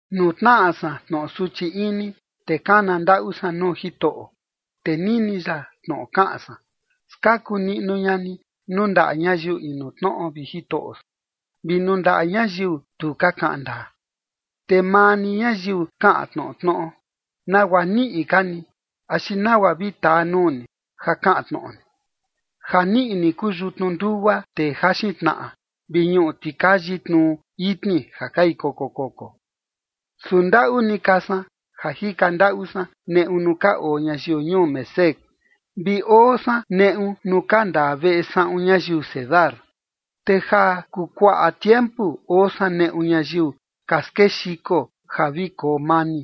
Nuu tnaꞌa san tnoꞌo suchi ini, te kana ndaꞌu san nuu Jitoꞌo, te nini ya tnoꞌo kaꞌan san. Skaku niꞌnu ña ni nuu ndaꞌa ñayiu inu tnoꞌo, vi Jitoꞌo san, vi nuu ndaꞌa ñayiu tu ka kaꞌan ndaa. Te maa ni ñayiu kaꞌan tnoꞌo tnoꞌo, ¿nagua niꞌi ka ni, axi nagua vi taa nuu ni ja kaꞌan tnoꞌo ni? Ja niꞌi ni kuu yutnu ndugua tee jaxin tnaꞌa, vi ñuꞌu tikayi tnu itni ja kai koko koko. Su ndaꞌu ni ka san ja jika ndaꞌu san neꞌu nuu ka oo ñayiu ñuu Mesec, vi oo san neꞌu nuu ka ndaa veꞌe saꞌun ñayiu Cedar. Te ja kuu kuaꞌa tiempu oo san neꞌu ñayiu, ka skexiko ja vi koo mani.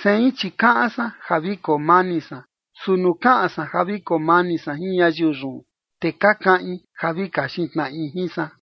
Sein chi kaꞌan san ja koo mani san, su nuu kaꞌan san ja vi koo mani san jin ñayiu yun, te ka kaꞌin ja vi kaxin tnaꞌi jin san.